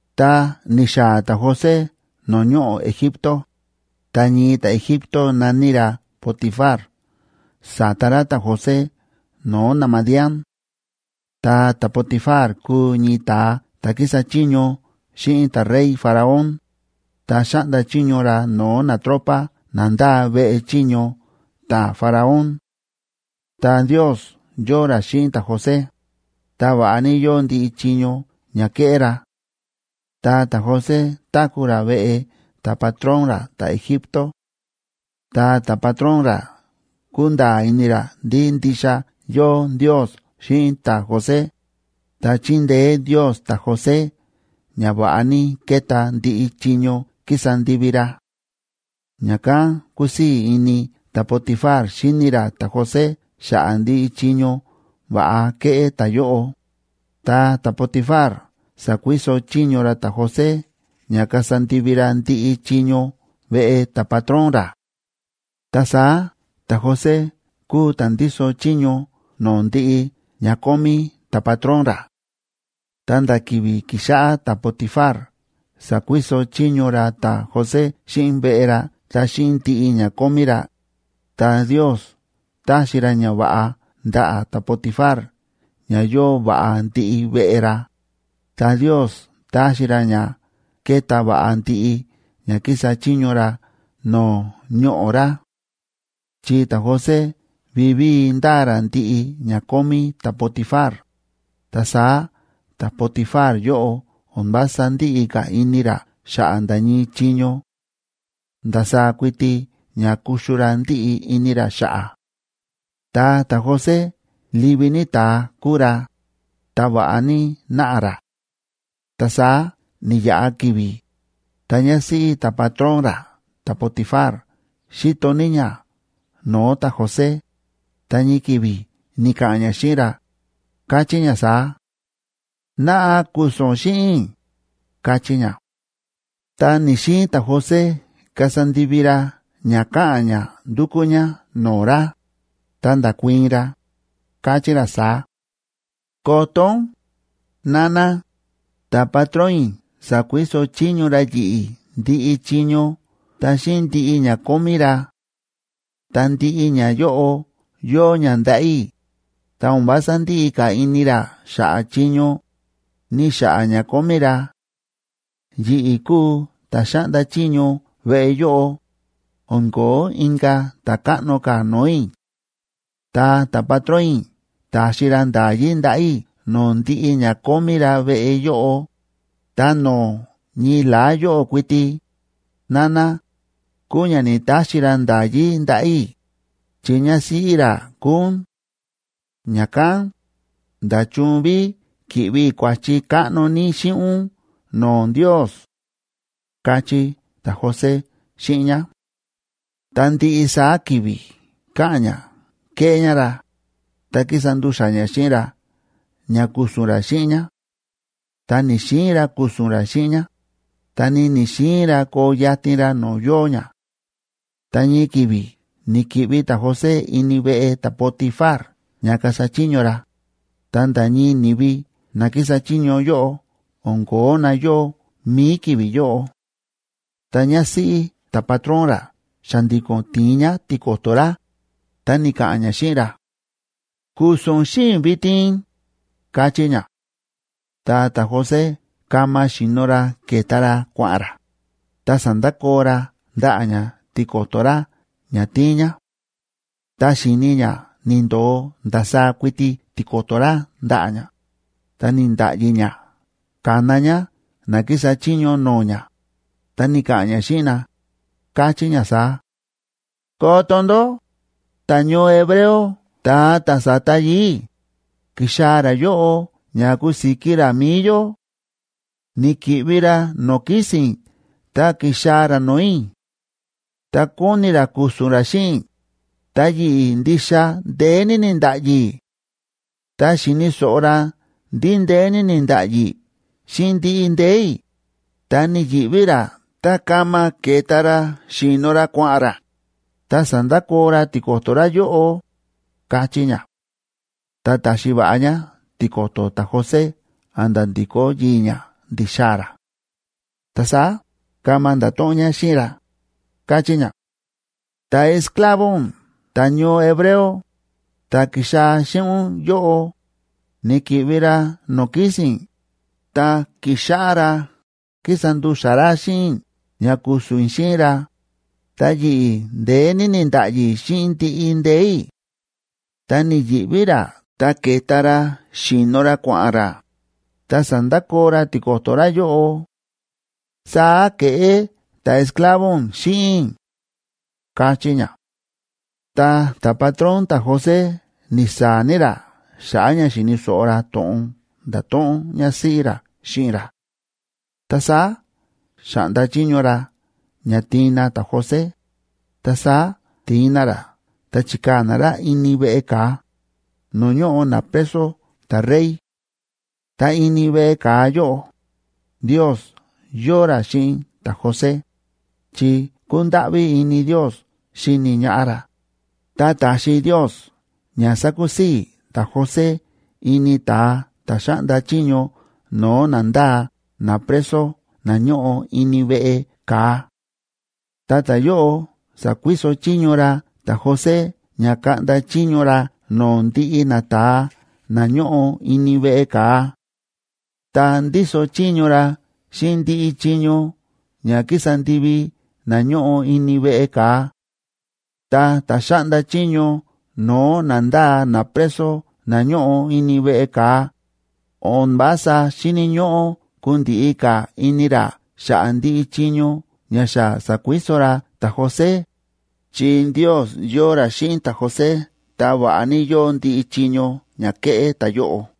Tá ni̱xaa̱ ta̱José no̱o̱ ñoꞌo̱ Egipto, ta ñii ta̱Egipto na̱ní ra Potifar sa̱ta ra ta̱José no̱o̱ naMadián.a Ta ta̱Potifar kúu ñii ta̱a ta̱ kísa chiño xíꞌin ta̱rey Faraón, ta xáꞌnda chiño ra no̱o̱ natropa na ndáa veꞌe chiño ta̱Faraón. Ta Ndiosb yóo ra xíꞌin ta̱José, ta va̱ꞌa ní yóo ndiꞌi chiño ña kéꞌé ra; ta ta̱José táku̱ ra veꞌe ta̱patrón ra ta̱Egipto. Ta ta̱patrón ra kúnda̱a̱ ini ra ndí ndixa yóo Ndios xíꞌin ta̱José, ta chíndeé Ndios ta̱José ña va̱ꞌa ní kéta ndiꞌi chiño kísa ndivi ra. Ña̱kán kúsii̱ ini ta̱Potifar xíni ra ta̱José xa̱ꞌa̱ ndiꞌi chiño va̱ꞌa kéꞌé ta̱yóꞌo, ta ta̱Potifar sa̱kuiso chiño ra ta̱José ña kasa ndivi ra ndiꞌi chiño veꞌe ta̱patrón ra. Ta saá ta̱José kúu ta̱ ndíso chiño no̱o̱ ndiꞌi ña kómí ta̱patrón ra. Ta nda̱ ki̱vi̱ ki̱xáꞌá ta̱Potifar sa̱kuiso chiño ra ta̱José xíꞌin veꞌe ra ta xíꞌin ndiꞌi ña kómí ra, ta Ndios táxi ra ñava̱ꞌa ndaꞌa̱ ta̱Potifar ña yóo va̱ꞌa ndiꞌi veꞌe ra, ta Ndios táxi ra ña kéta va̱ꞌa ndiꞌi ña kísa chiño ra no̱o̱ ñoꞌo̱ ra. Chi ta̱José vivíi ndáa ra ndiꞌi ña kómí ta̱Potifar, ta saá ta̱Potifar yóꞌo o̱n vása ndíꞌi ka̱ ini ra xa̱ꞌa̱ nda̱ ñii chiño; ndasaá kuiti ña kuxu ra ndíꞌi ini ra xa̱ꞌa̱. Ta ta̱José livi ní ta̱a kúu ra, ta va̱ꞌa ní náꞌa ra. Ta saá ni̱yaꞌa ki̱vi̱, ta ñásíꞌí ta̱patrón ra ta̱Potifar xíto ní ñá no̱o̱ ta̱José, ta ñii ki̱vi̱ ni̱ka̱ꞌa̱n ñá xíꞌin ra, káchí ñá saá: ―Naꞌa, ku̱su̱n ún xíꞌin i̱ ―káchí ñá. Ta ni̱‑xiin ta̱José kasa ndivi ra ña káꞌa̱n ñá ndúkú ñá no̱o̱ ra, ta nda̱kuii̱n ra, káchí ra saá: ―Koto ún, nana, ta̱patrón i̱ sa̱kuiso chiño ra yi̱ꞌi̱ ndiꞌi chiño ta xíꞌin ndiꞌi ña kómí ra. Ta ndiꞌi ñayóꞌo yóo ña ndaꞌa̱ i̱, ta o̱n vása ndíꞌi ka̱ ini ra xa̱ꞌa̱ chiño, ni xa̱ꞌa̱ ña kómí ra. Yi̱ꞌi̱ kúu ta̱ xáꞌnda chiño veꞌe yóꞌo, o̱n ko̱ó inka̱ ta̱káꞌno ka̱ no̱o̱ i̱. Ta ta̱patrón i̱ ta̱xi ra nda̱yí ndaꞌa̱ i̱ no̱o̱ ndiꞌi ña kómí ra veꞌe yóꞌo, ta no̱o̱ ñii la̱á yóꞌó kuiti, nana, kúu ña ni̱‑taxi ra nda̱yí ndaꞌa̱ i̱, chi ñásíꞌí ra kúu ún. Ña̱kán, ¿nda̱chun ví ki̱ꞌvi i̱ kua̱chi káꞌno ní xíꞌin ún no̱o̱ Ndios? ―káchí ta̱José xíꞌin ñá. Ta ndiꞌi saá ki̱vi̱ káꞌa̱n ñá kéꞌé ñá ra, ta kísa ndu̱xa̱ ñá xíꞌin ra ña ku̱su̱n ra xíꞌin ñá. Ta ni̱‑xiin ra ku̱su̱n ra xíꞌin ñá, ta ni ni̱‑xiin ra koo yatin ra no̱o̱ yóo ñá. Ta ñii ki̱vi̱ ni̱ki̱ꞌvi ta̱José ini veꞌe ta̱Potifar ña kasa chiño ra, ta nda̱ ñii ni̱vi na kísa chiño yóꞌo o̱n ko̱ó na yóo mi̱i ki̱vi̱ yóꞌo. Ta ñásíꞌí ta̱patrón ra xa̱ndi̱ko̱n ti̱in ñá tiko̱to̱ ra, ta ni̱ka̱ꞌa̱n ñá xíꞌin ra: ―Ku̱su̱n ún xíꞌin i̱ vitin ―káchí ñá. Ta ta̱José kama xi̱no ra ke̱ta ra kua̱ꞌa̱n ra, ta sa̱ndakoo ra ndaꞌa̱ ñá tiko̱to̱ ra ña ti̱in ñá. Tá xi̱ni ñá ni̱ndo̱o ndasaá kuiti tiko̱to̱ ra ndaꞌa̱ ñá, ta ni̱nda̱ꞌyi ñá ka̱na ñá na kísa chiño no̱o̱ ñá, ta ni̱ka̱ꞌa̱n ñá xíꞌin na, káchí ñá saá: ―Koto ndó, ta̱ñoo hebreo ta̱a ta̱ sa̱ta yii̱ i̱, ki̱xaa̱ ra yóꞌo ña kusiki ra mi̱i yó. Ni̱ki̱ꞌvi ra no̱o̱ kísi̱n i̱ ta ki̱xaa̱ ra no̱o̱ i̱, ta kóni ra ku̱su̱n ra xíꞌin i̱, ta yi̱ꞌi̱ ndixa ndeé ní ni̱nda̱ꞌyi i̱. Tá xi̱ni̱ so̱ꞌo ra ndí ndeé ní ni̱nda̱ꞌyi i̱ xíꞌin ndiꞌi ndee̱ i̱, ta ni̱yi̱ꞌví ra ta kama ke̱ta ra xi̱no ra kua̱ꞌa̱n ra, ta sa̱ndakoo ra tiko̱to̱ ra yóꞌo ―káchí ñá. Ta ta̱xi va̱ꞌa ñá tiko̱to̱ ta̱José a̱nda̱ ndi̱kó yii̱ ñá ndi̱xaa̱ ra. Ta saá kama nda̱to̱ꞌon ñá xíꞌin ra, káchí ñá: ―Ta̱esclavo ún ta̱ñoo hebreo, ta̱ ki̱xaa̱ xíꞌin ún yóꞌo, ni̱ki̱ꞌvi ra no̱o̱ kísi̱n i̱, ta ki̱xáꞌá ra kísa ndu̱xa̱ ra xíꞌin i̱ ña ku̱su̱n i̱ xíꞌin ra, ta yi̱ꞌi̱ ndeé ní ni̱nda̱ꞌyi i̱ xíꞌin ndiꞌi ndee̱ i̱, ta ni̱yi̱ꞌví ra ta ke̱ta ra xi̱no ra kua̱ꞌa̱n ra, ta sa̱ndakoo ra tiko̱to̱ ra yóꞌo. Saá ke̱ꞌé ta̱esclavo ún xíꞌin i̱ ―káchí ñá. Ta ta̱patrón ta̱José ni̱saa̱ ní ra xa̱ꞌa̱ ña xi̱ni̱ so̱ꞌo ra to̱ꞌon nda̱to̱ꞌon ñásíꞌí ra xíꞌin ra. Ta saá xa̱ꞌnda chiño ra ña tiin na ta̱José, ta saá ti̱in na ra ta chi̱kaa̱ na ra ini veꞌe ka̱a, no̱o̱ ñóꞌo napreso ta̱rey. Ta ini veꞌe ka̱a yóꞌo, Ndios yóo ra xíꞌin ta̱José, chi kúndáꞌví ini Ndios xíni ñaꞌá ra, ta ta̱xi Ndios ña sákusii̱ ta̱José ini ta̱a ta̱ xáꞌnda chiño no̱o̱ na ndáa napreso na ñóꞌo ini veꞌe ka̱a. Ta ta̱yóꞌo sa̱kuiso chiño ra ta̱José ña kaꞌnda chiño ra no̱o̱ ndiꞌi nata̱a na ñóꞌo ini veꞌe ka̱a. Ta ndíso chiño ra xíꞌin ndiꞌi chiño ña kísa ndivi na ñóꞌo ini veꞌe ka̱a. Ta ta̱ xáꞌnda chiño no̱o̱ na ndáa napreso na ñóꞌo ini veꞌe ka̱a, o̱n vása xíni̱ ñóꞌó kundiꞌi ka̱ ini ra xa̱ꞌa̱ ndiꞌi chiño ña xa sa̱kuiso ra ta̱José, chi Ndios yóo ra xíꞌin ta̱José, ta va̱ꞌa ní yóo ndiꞌi chiño ña kéꞌé ta̱yóꞌo.